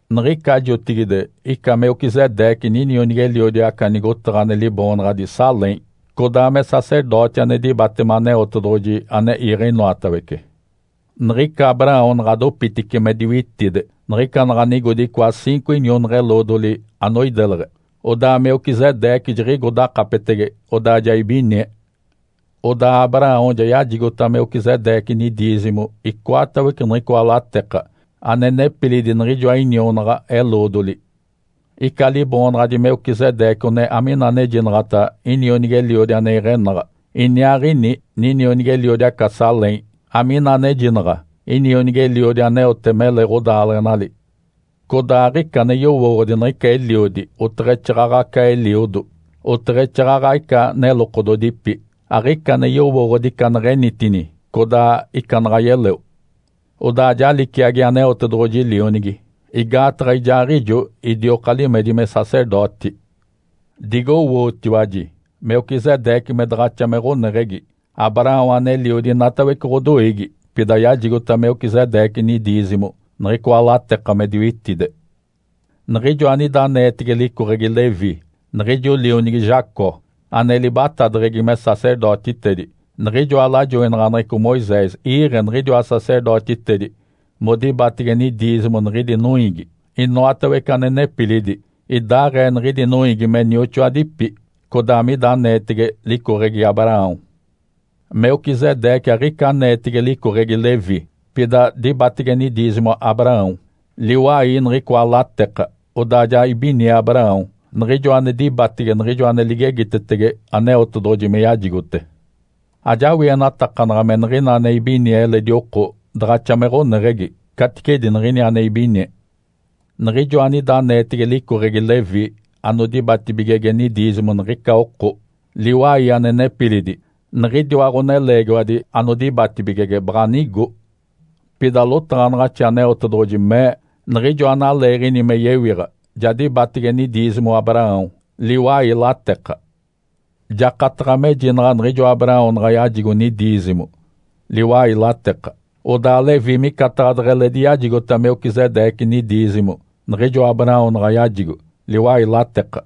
Niɡ̶ica jotigide ica Melquisedeque ninionigi-eliodi aca nigotaɡ̶a ane liboonaɡ̶adi Salém, codaa me sacerdoti ane dibatema Aneotedoɡ̶oji ane iiɡ̶e inoatawece. Niɡ̶ica Abraão naɡ̶a dopitice me diwitide niɡ̶ica naɡ̶a nigodi icoa ciinco inionaɡ̶a-eloodoli anoideleɡ̶e, odaa Melquisedeque jiɡ̶igo dakapetege, odaa ja ibinie. Odaa Abraão ja yajigota Melquisedeque nidiizimo icoatawece niɡ̶icoa lateka ane nepilidi niɡ̶ijoa inionaɡ̶a-eloodoli. Ica liboonaɡ̶adi Melquisedeque one amina anejinaɡ̶ata “Inionigi-eliodi ane iɡ̶enaɡ̶a”, iniaaɡ̶ini ninionigi-eliodi aca Salém, amina anejinaɡ̶a “Inionigi-eliodi aneote mele ɡ̶odaaleɡ̶enali”. Codaa aɡ̶ica ane yowooɡ̶odi niɡ̶ica eliodi oteɡ̶exaaɡ̶aɡ̶a aca eliodo, oteɡ̶exaaɡ̶aɡ̶a ica nelokododipi. Aɡ̶ica ane yowooɡ̶odi ica neɡ̶enitini, codaa ica naɡ̶a yeleo. Odaa ja liciagi Aneotedoɡ̶oji Lionigi, igaataɡ̶a ijaaɡ̶ijo idioka limedi me sacerdoti. Digowootiwaji Melquisedeque me daɡ̶axa me ɡ̶oneɡ̶egi! Abraão aneliodi inatawece ɡ̶odoiigi pida yajigota Melquisedeque nidiizimo niɡ̶icoa lateka me diwitide. Niɡ̶ijo anida aneetege licoɡ̶egi Levi, niɡ̶ijo lionigi Jacó, ane libatadeɡ̶egi me sacerdotitedi. Niɡ̶ijoa lajoinaɡ̶aneɡ̶eco Moisés iiɡ̶e niɡ̶idiwa sacerdotitedi modibatege nidiizimo niɡ̶idi noiigi, inoatawece ane nepilidi, idaaɡ̶ee niɡ̶idi noiigi me nioxoadipi, codaa mida aneetege licoɡ̶egi Abraão. Melquisedeque aɡ̶ica aneetege licoɡ̶egi Levi, pida dibatege nidiizimo Abraão, liwai niɡ̶icoa lateka. Odaa ja ibinie Abraão, niɡ̶ijo ane dibatege niɡ̶ijo ane ligegitetege Aneotedoɡ̶oji me yajigote. Ajawienatakanaɡ̶a me niɡ̶ina ane ibinie eledi oko daɡ̶axa me ɡ̶oneɡ̶egi caticedi niɡ̶ini ane ibinie. Niɡ̶ijo anida aneetege licoɡ̶egi Levi anodibatibigege nidiizimo niɡ̶ica oko, liwai ane nepilidi, niɡ̶idiwa ɡ̶oneleegiwadi anodibatibigege baɡ̶a nigo. Pida lotaɡ̶anaɡ̶axi Aneotedoɡ̶oji mee niɡ̶ijo analeeɡ̶ini me yewiɡ̶a ja dibatege nidiizimo Abraão, liwai lateka. Jakataɡ̶a mejinaɡ̶a niɡ̶ijo Abraão naɡ̶a yajigo nidiizimo, liwai lateka, odaa Levi micataɡ̶a deɡ̶eledi yajigota Melquisedeque nidiizimo niɡ̶ijo Abraão naɡ̶a yajigo, liwai lateka.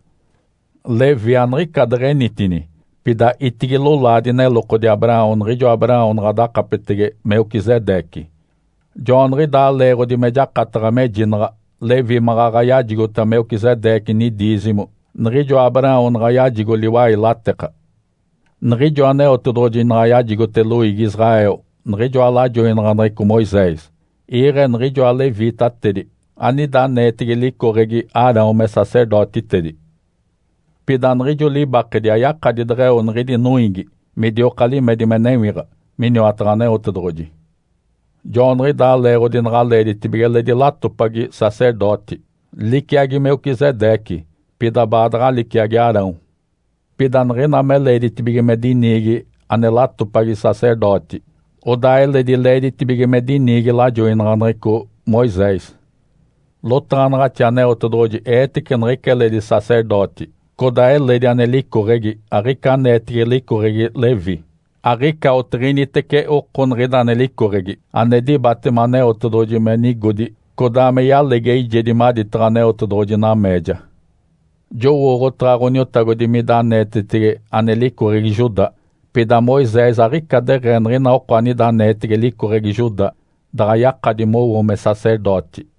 Levi aniɡ̶ica deɡ̶enitini, pida itigi lolaadi nelokodi Abraão niɡ̶ijo Abraão naɡ̶a dakapetege Melquisedeque. (Joaniɡ̶idaa leeɡ̶odi me jakataɡ̶a mejinaɡ̶a Levi maɡ̶aɡ̶a yajigota Melquisedeque nidiizimo niɡ̶ijo Abraão naɡ̶a yajigo liwai lateka.) Niɡ̶ijo Aneotedoɡ̶oji naɡ̶a yajigote loiigi Israel niɡ̶ijoa lajoinaɡ̶aneɡ̶eco Moisés, iiɡ̶e niɡ̶ijoa leviitatedi anida aneetege licoɡ̶egi Arão me sacerdotitedi. Pida niɡ̶ijo libakedi ayakadi deɡ̶eo niɡ̶idi noiigi midioka limedi me newiɡ̶a miniwataɡ̶a Aneotedoɡ̶oji. Joaniɡ̶idaa leeɡ̶odi naɡ̶a leeditibige eledi latopagi sacerdoti, liciagi Melquisedeque, pida baadaɡ̶a liciagi Arão. Pida niɡ̶ina me leeditibige me diniigi ane latopagi sacerdoti, odaa eledi leeditibige me diniigi lajoinaɡ̶aneɡ̶eco Moisés. Lotaɡ̶anaɡ̶axi Aneotedoɡ̶oji eetece niɡ̶ica eledi sacerdoti, codaa eledi ane licoɡ̶egi, aɡ̶ica aneetege licoɡ̶egi Levi. Aɡ̶ica otiɡ̶initece oko niɡ̶ida ane licoɡ̶egi ane dibatema Aneotedoɡ̶oji me nigodi codaa me yalegi eijedi maditaɡ̶a Aneotedoɡ̶oji nameeja. Jowooɡ̶otaɡ̶a Ǥoniotagodi mida aneetetege ane licoɡ̶egi Judá. Pida Moisés aɡ̶ica deɡ̶ee niɡ̶ina oko anida aneetege licoɡ̶egi Judá daɡ̶a yakadi mowo me sacerdoti.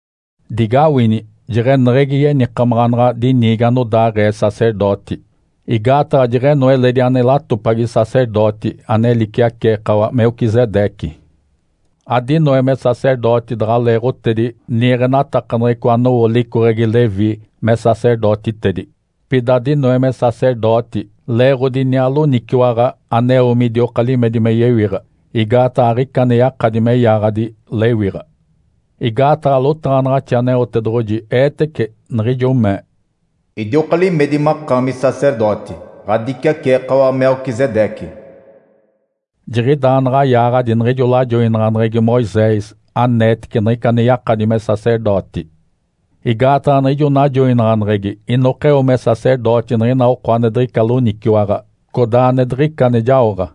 Digawini jeɡ̶eneɡ̶egi yenikamaɡ̶a naɡ̶a diniigi anodaaɡ̶ee sacerdoti, igaataɡ̶a jeɡ̶eno eledi ane latopagi sacerdoti ane liciaceekawa Melquisedeque. Adinoe me sacerdoti daɡ̶a leeɡ̶otedi niiɡ̶enatakaneɡ̶eco anowo licoɡ̶egi Levi me sacerdotitedi. Pida dinoe me sacerdoti leeɡ̶odi iniaa loniciwaɡ̶a aneo midioka limedi me yewiɡ̶a, igaataɡ̶a aɡ̶ica ane yakadi me yaaɡ̶adi lewiɡ̶a. Igaataɡ̶a lotaɡ̶anaɡ̶axi Aneotedoɡ̶oji eetece, niɡ̶ijo mee, “Idioka limedi makaami sacerdoti, ɡ̶adiciaceekawa Melquisedeque.” Jiɡ̶idaa naɡ̶a yaaɡ̶adi niɡ̶ijo lajoinaɡ̶aneɡ̶egi Moisés aneetece niɡ̶ica ane yakadi me sacerdoti. Igaataɡ̶a niɡ̶ijo najoinaɡ̶aneɡ̶egi inokeo me sacerdoti niɡ̶ina oko ane diɡ̶ica loniciwaɡ̶a, codaa ane diɡ̶ica ane jaoɡ̶a.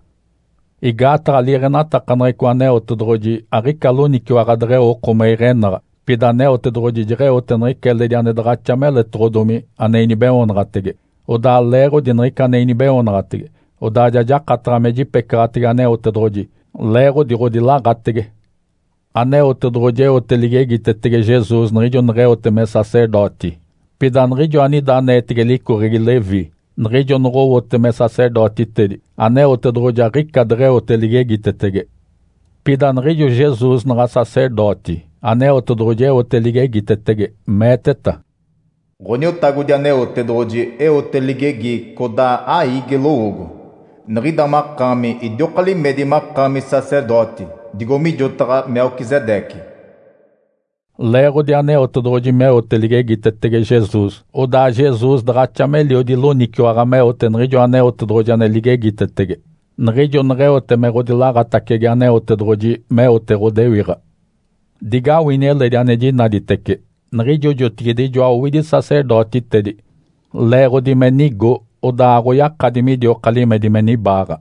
Igaataɡ̶a liiɡ̶enatakaneɡ̶eco Aneotedoɡ̶oji aɡ̶ica loniciwaɡ̶a deɡ̶eo oko me iɡ̶enaɡ̶a. Pida Aneotedoɡ̶oji jeɡ̶eote niɡ̶ica eledi ane daɡ̶axa meletoɡ̶odomi ane inibeoonaɡ̶atege. Odaa leeɡ̶odi niɡ̶ica ane inibeoonaɡ̶atege, odaa ja jakataɡ̶a me jipecaɡ̶atege Aneotedoɡ̶oji, leeɡ̶odi ɡ̶odilaɡ̶atege. Aneotedoɡ̶oji eote ligegitetege Jesus niɡ̶ijo neɡ̶eote me sacerdoti. Pida niɡ̶ijo anida aneetege licoɡ̶egi Levi niɡ̶ijo noɡ̶owote me sacerdotitedi, Aneotedoɡ̶oji aɡ̶ica deɡ̶eote ligegitetege. Pida niɡ̶ijo Jesus naɡ̶a sacerdoti, Aneotedoɡ̶oji eote ligegitetege, meeteta, “Ǥoniotagodi Aneotedoɡ̶oji eote ligegi codaa aiigi lowoogo. Niɡ̶ida makaami idioka limedi makaami sacerdoti, digo mijotaɡ̶a Melquisedeque.” Leeɡ̶odi Aneotedoɡ̶oji meote ligegitetege Jesus, odaa Jesus daɡ̶axa meliodi loniciwaɡ̶a meote niɡ̶ijo Aneotedoɡ̶oji ane ligegitetege, niɡ̶ijo neɡ̶eote me ɡ̶odilaɡ̶atacege Aneotedoɡ̶oji meote ɡ̶odewiɡ̶a. Digawini eledi ane jinaditece. Niɡ̶ijo jotigide ijoa owidi sacerdotitedi leeɡ̶odi me nigo odaa aɡ̶oyakadi midioka limedi me nibaaɡ̶a.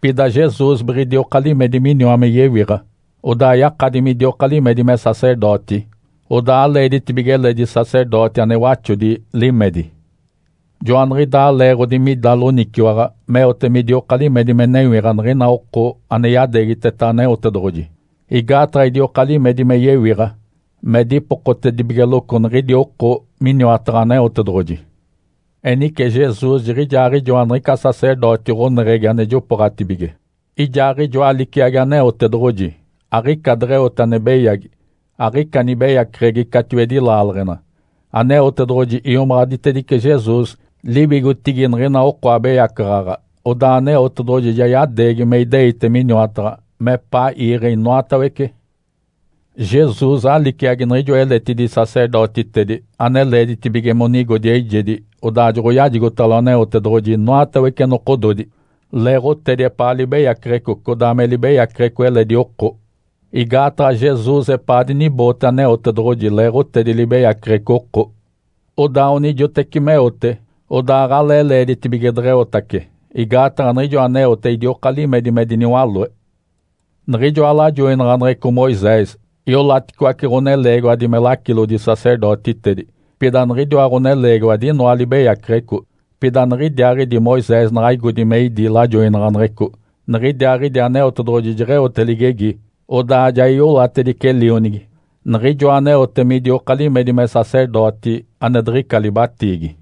Pida Jesus biɡ̶idioka limedi miniwa me yewiɡ̶a, odaa yakadi midioka limedi me sacerdoti, odaa aleeditibige eledi sacerdoti ane waxodi limedi. Joaniɡ̶idaa leeɡ̶odi mida loniciwaɡ̶a meote midioka limedi me newiɡ̶a niɡ̶ina oko ane yadeegiteta Aneotedoɡ̶oji, igaataɡ̶a idioka limedi me yewiɡ̶a me dipokotedibigeloco niɡ̶idi oko miniwataɡ̶a Aneotedoɡ̶oji. Enice Jesus jiɡ̶ijaaɡ̶ijoa niɡ̶ica sacerdoti ɡ̶oneɡ̶egi ane jopooɡ̶atibige. Ijaaɡ̶ijoa liciagi Aneotedoɡ̶oji, aɡ̶ica deɡ̶eote ane beyagi, aɡ̶ica nibeyaceɡ̶egi catiwedi laaleɡ̶ena. Aneotedoɡ̶oji iomaɡ̶aditedice Jesus liwigotigi niɡ̶ina oko abeyacaɡ̶aɡ̶a, odaa Aneotedoɡ̶oji ja yadeegi me ideite miniwataɡ̶a mepaa iiɡ̶e inoatawece. Jesus aliciagi niɡ̶ijoa eletidi sacerdotitedi ane leeditibige monigodi eijedi odaa joɡ̶oyajigotalo Aneotedoɡ̶oji inoatawece nokododi, leeɡ̶otedi epaa libeyaceɡ̶eco codaa me libeyaceɡ̶eco eledi oko. Igaataɡ̶a Jesus epaa diniboote Aneotedoɡ̶oji leeɡ̶otedi libeyaceɡ̶eco oko. Odaa onijoteci meote, odaa aɡ̶alee leeditibige deɡ̶eotace, igaataɡ̶a niɡ̶ijo aneote idioka limedi me diniwaloe. Niɡ̶ijoa lajoinaɡ̶aneɡ̶eco Moisés iolaticoace ɡ̶oneleegiwadi me lacilodi-sacerdotitedi, pida niɡ̶idiwa ɡ̶oneleegiwadi inoa libeyaceɡ̶eco. Pida niɡ̶idiaaɡ̶idi Moisés naɡ̶a igodi me idí lajoinaɡ̶aneɡ̶eco, niɡ̶idiaaɡ̶idi Aneotedoɡ̶oji jeɡ̶eote ligegi, odaa ja iolatedice Lionigi, niɡ̶ijoa aneote midioka limedi me sacerdoti ane diɡ̶ica libatiigi.